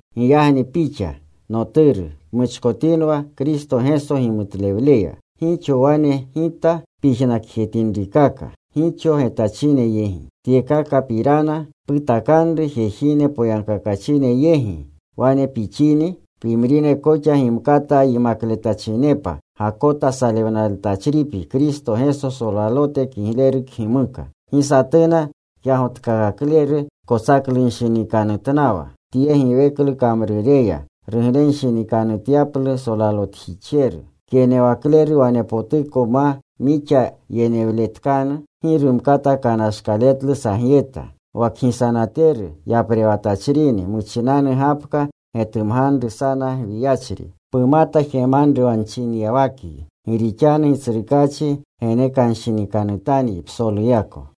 Giyagni pixa, noturu, pmuchkotinwa Kristo Geso gimutlewleya. Gixo wane gita pyijnakotinrikaka gixo getachine yegi. Tyekakapirana putakanru jejine poyagkakachine yegi. Wane pixini pimrine koxa gimkata yimakletachinepa. Gakota salewnaletachripyi Kristo Geso solalote kigleru kgimuka. Gi satuna kyagotkakakleru kotsaklunshinikanutnawa tye giweklu kamrureya, ruglenshinikanutyaplu solalotjixjeru. Kyenewakleru wanepotuko ma mixa yenewletkanu, gi rumkata kanashkaletlu sagyeta. Wa kgisanateru yaprewatachrini muchinanu gapka getumganru sana gwiyachri. Pumata jemanru wa nchinyawakyi. Gi rixanu Gitsrukaachi genekanshinikanutanyi psoluyako.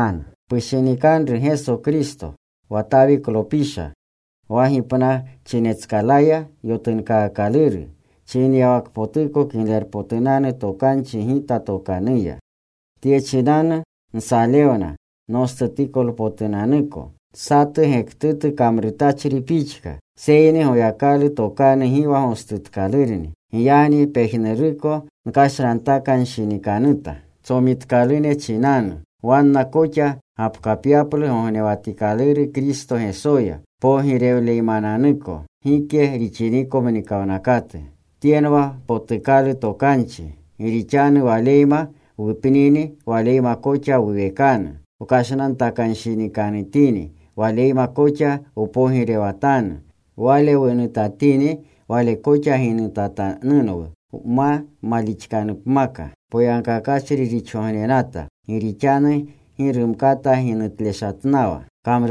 Pushinikanru Geso Kristo, wa Tawiklopisha, wa gipnachinetskalaya yotunkakikaluru, chinyawakpotuko Kiglerpotunanu Tokanchi gita tokanuya. Tye chinanu nsalewna nostutikolpotunanuko, satu gektutu kamrutachri pixka. Seyni Goyakalu tokanu gi wa gostutkalurni. Giyagni pejnuruko nkashnantakanshinikanuta tsomitkalune chinanu, wanna koxa gapkapyaplu gognewatikaluru Kristo Gesoya, pogirewluymananuko gike rixiniko mnikawnakatu. Tyenwa potukalu tokanchi: Gi rixanu Waleyma wupnini, Waleyma koxa wuwekanu. Wkashnantakanshinikanutini, Waleyma koxa wpogirewatanu. Wale wunutatini, Wale koxa ginutatanunwu. Wma malixinipmaka, poyagkakachri rixgognenata. Gi rixanu gi rumkata ginutleshatnawa.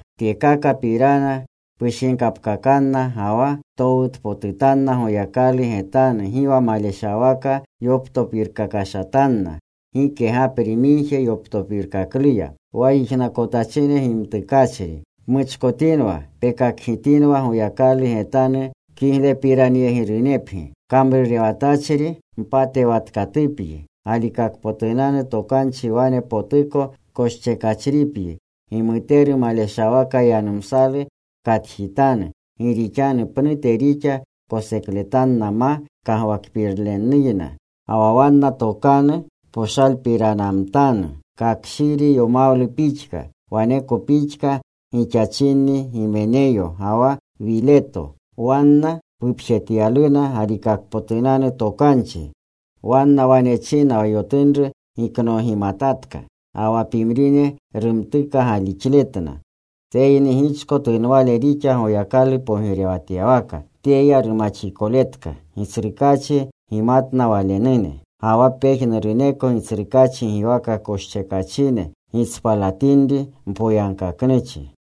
Tyekakapirana pushinkapkakanna ga wa ptowutpotutanna Goyakalu getanu gi wa maleshawaka yoptopirkakashatanna gike gapri migje yoptopirkakluya, wa yijnakotachine gimtukachri. Pmuchkotinwa pekakgitinwa Goyakalu getanu kiglepiranyegirupyi. Kamrurewatachri mpatewatkatupyi. Galikakpotunanu tokanchi wane potuko koschekachripyi. Gimuteru maleshawaka yanumsalu pkatjitanu, gi rixanu pnute rixa kosekletanna ma kagwakpirnukleyna. Ga wa wanna tokanu poshalpiranamtanu kakshiri yomawlu pixka. Waneko pixka gixachinni Gimeneyo ga wa Wileto. Wanna pupjetyaluna galikakpotunanu tokanchi. Wanna wane china wa yotunru giknoogimatatka. Ga wa pimrine rumtuka galixletna. Seyni gichko tunwale rixa Goyakalu poyegityawaka. Tyeya rumaxikoletka: Gitsrukaachi gimatna Walenune. Ga wa pejnuruneko Gitsrukaachi giwaka koschekachine gitspalatinri mpoyagkaknuchi.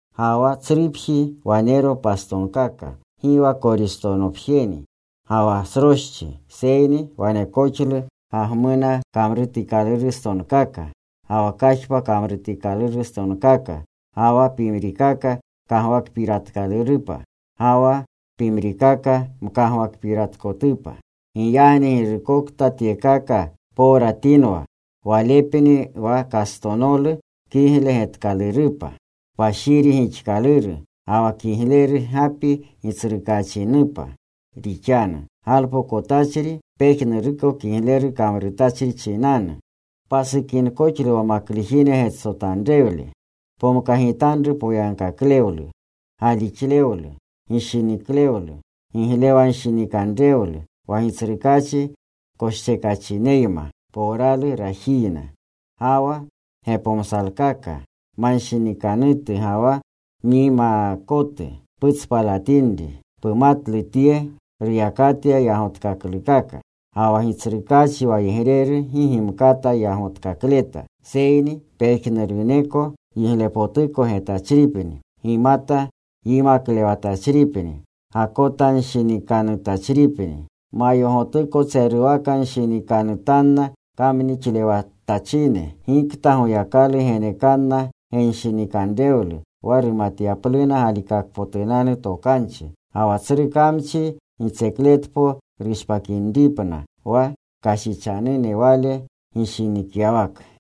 Ga wa tsrupji wanero pastonkaka, gi wa koristonopjeni ga wa sroschi, seyni wanekoxlu gagmuna kamrutikalurstonkaka ga wa kajpa kamrutikalurstonkaka. Ga wa pimrikaka kagwakpiratkalurupa, ga wa pimrikaka mkagwakpiratkotupa. Giyagni girukokta tyekaka powratinwa, walepni wa kastonolu kigle getkalurupa, kpashiri gixkaluru, ga wa kigleru gapi Gitsrukaachinupa rixanu, galpokotachri pejnuruko kigleru kamrurchi chinanu. Pasukinkoxlu wa maklujine getsotanrewle. Pomkagitanru poyagkaklewlu, galixlewlu, gishiniklewlu, giglewanshinikanrewlu, wa Gitsrukaachi koschekachineyma powralu rajiyna. Ga wa gepomsalkaka manshinikanutu ga wa myimaakotu putspalatinri. Pumatlu tye ruyakatya yagotkaklukaka. Ga wa Gitsrukaachi wayegreru gi gimkata yagotkakleta, seyni pejnuruneko yiglepotuko getachripni. Gimata yimaklewletachripni. Gakotanshinikanutachripni. Mayogotuko tseruwakanshinikanutanna kamnixlewatachine, gikta Goyakalu genekanna genshinikanrewlu wa rumatyapluna galikakpotunanu Tokanchi, ga wa tsru kamchi gitsekletpo rushpakinripna wa kashichanune wale gishinikyawaka.